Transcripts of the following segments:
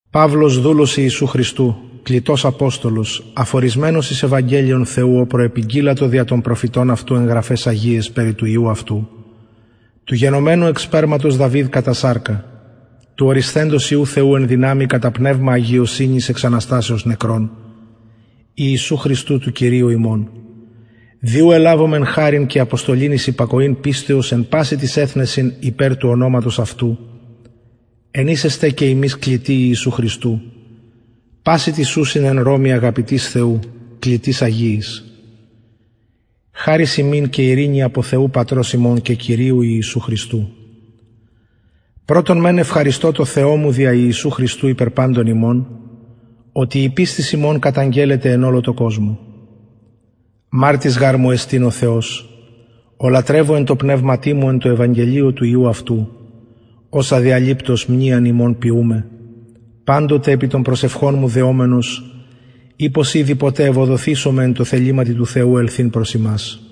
παυλος δουλος ιησου χριστου κλητος αποστολος αφωρισμενος εις ευαγγελιον θεου ο προεπηγγειλατο δια των προφητων αυτου εν γραφαις αγιαις περι του υιου αυτου του γενομενου εκ σπερματος δαυιδ κατα σαρκα του ορισθεντος υιου θεου εν δυναμει κατα πνευμα αγιωσυνης εξ αναστασεως νεκρων ιησου χριστου του κυριου ημων δι ου ελαβομεν χαριν και αποστολην εις υπακοην πιστεως εν πασιν τοις εθνεσιν υπερ του ονοματος αυτου εν οις εστε και υμεις κλητοι ιησου χριστου πασιν τοις ουσιν εν ρωμη αγαπητοις θεου κλητοις αγιοις χαρις υμιν και ειρηνη απο θεου πατρος ημων και κυριου ιησου χριστου πρωτον μεν ευχαριστω τω θεω μου δια ιησου χριστου υπερ παντων υμων οτι η πιστις υμων καταγγελλεται εν ολω τω κοσμω μαρτυς γαρ μου εστιν ο θεος ω λατρευω εν τω πνευματι μου εν τω ευαγγελιω του υιου αυτου ως αδιαλειπτως μνειαν υμων ποιουμαι παντοτε επι των προσευχων μου δεομενος ει πως ηδη ποτε ευοδωθησομαι εν τω θεληματι του θεου ελθειν προς υμας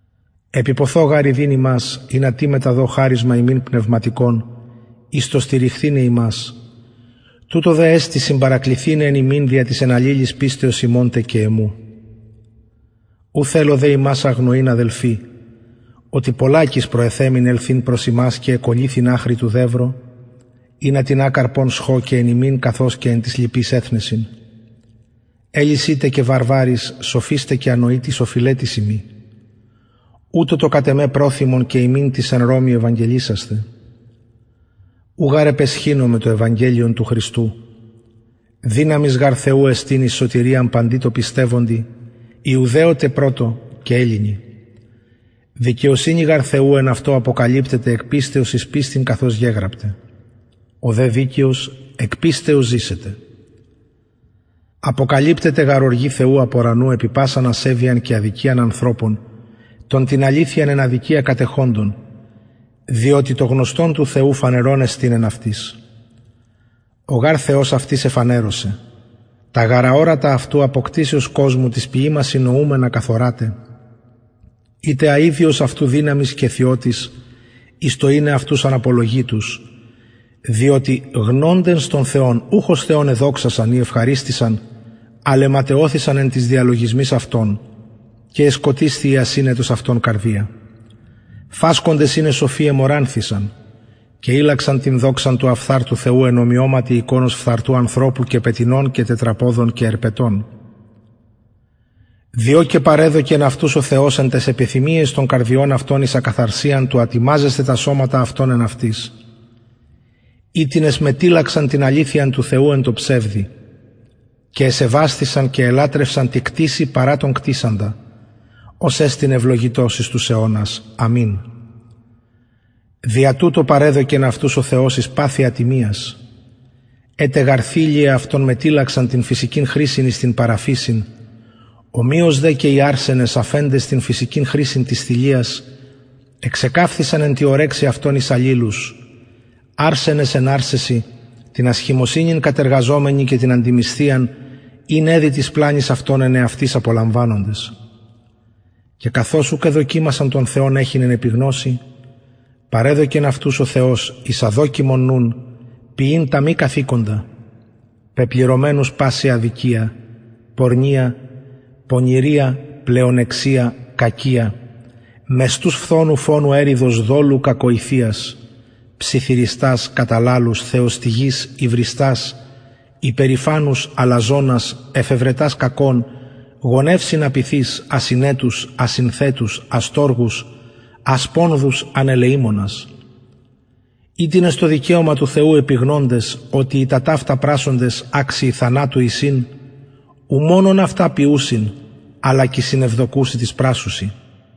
επιποθω γαρ ιδειν υμας ινα τι μεταδω χαρισμα υμιν πνευματικον εις το στηριχθηναι υμας τουτο δε εστιν συμπαρακληθηναι εν υμιν δια της εν αλληλοις πιστεως υμων τε και εμου ου θελω δε υμας αγνοειν αδελφοι οτι πολλακις προεθεμην ελθειν προς υμας και εκωλυθην αχρι του δευρο ινα τινα καρπον σχω και εν υμιν καθως και εν τοις λοιποις εθνεσιν ελλησιν τε και βαρβαροις σοφοις τε και ανοητοις οφειλετης ειμι ουτως το κατ εμε προθυμον και υμιν τοις εν ρωμη ευαγγελισασθαι ου γαρ επαισχυνομαι το ευαγγελιον του χριστου δυναμις γαρ θεου εστιν εις σωτηριαν παντι τω πιστευοντι ιουδαιω τε πρωτον και ελληνι δικαιοσυνη γαρ θεου εν αυτω αποκαλυπτεται εκ πιστεως εις πιστιν καθως γεγραπται ο δε δικαιος εκ πιστεως ζησεται αποκαλυπτεται γαρ οργη θεου απ ουρανου επι πασαν ασεβειαν και αδικιαν ανθρωπων των την αληθειαν εν αδικια κατεχοντων διοτι το γνωστον του θεου φανερον εστιν εν αυτοις ο γαρ θεος αυτοις εφανερωσεν τα γαρ αορατα αυτου απο κτισεως κοσμου τοις ποιημασιν νοουμενα καθοραται η τε αιδιος αυτου δυναμις και θειοτης εις το ειναι αυτους αναπολογητους διοτι γνοντες τον θεον ουχ ως θεον εδοξασαν η ευχαριστησαν αλλ εματαιωθησαν εν τοις διαλογισμοις αυτων και εσκοτισθη η ασυνετος αυτων καρδια φασκοντες ειναι σοφοι εμωρανθησαν και ηλλαξαν την δοξαν του αφθαρτου θεου εν ομοιωματι εικονος φθαρτου ανθρωπου και πετεινων και τετραποδων και ερπετων διο και παρεδωκεν αυτους ο θεος εν ταις επιθυμιαις των καρδιων αυτων εις ακαθαρσιαν του ατιμαζεσθαι τα σωματα αυτων εν εαυτοις οιτινες μετηλλαξαν την αληθειαν του θεου εν τω ψευδει και εσεβασθησαν και ελατρευσαν τη κτισει παρα τον κτισαντα ος εστιν ευλογητος εις τους αιωνας αμην δια τουτο παρεδωκεν αυτους ο θεος εις παθη ατιμιας αι τε γαρ θηλειαι αυτων μετηλλαξαν την φυσικην χρησιν εις την παρα φυσιν ομοιως τε και οι αρρενες αφεντες την φυσικην χρησιν της θηλειας εξεκαυθησαν εν τη ορεξει αυτων εις αλληλους αρσενες εν αρσεσιν την ασχημοσυνην κατεργαζομενοι και την αντιμισθιαν ην εδει της πλανης αυτων εν εαυτοις απολαμβανοντες και καθως ουκ εδοκιμασαν τον θεον εχειν εν επιγνωσει παρεδωκεν αυτους ο θεος εις αδοκιμον νουν ποιειν τα μη καθηκοντα πεπληρωμενους παση αδικια πορνεια πονηρια πλεονεξια κακια μεστους φθονου φονου εριδος δολου κακοηθειας ψιθυριστας καταλαλους θεοστυγεις υβριστας υπερηφανους αλαζονας εφευρετας κακων γονευσιν απειθεις ασυνετους ασυνθετους αστοργους ασπονδους ανελεημονας οιτινες το δικαιωμα του θεου επιγνοντες οτι οι τα τοιαυτα πρασσοντες αξιοι θανατου εισιν ου μονον αυτα ποιουσιν αλλα και συνευδοκουσιν τοις πρασσουσιν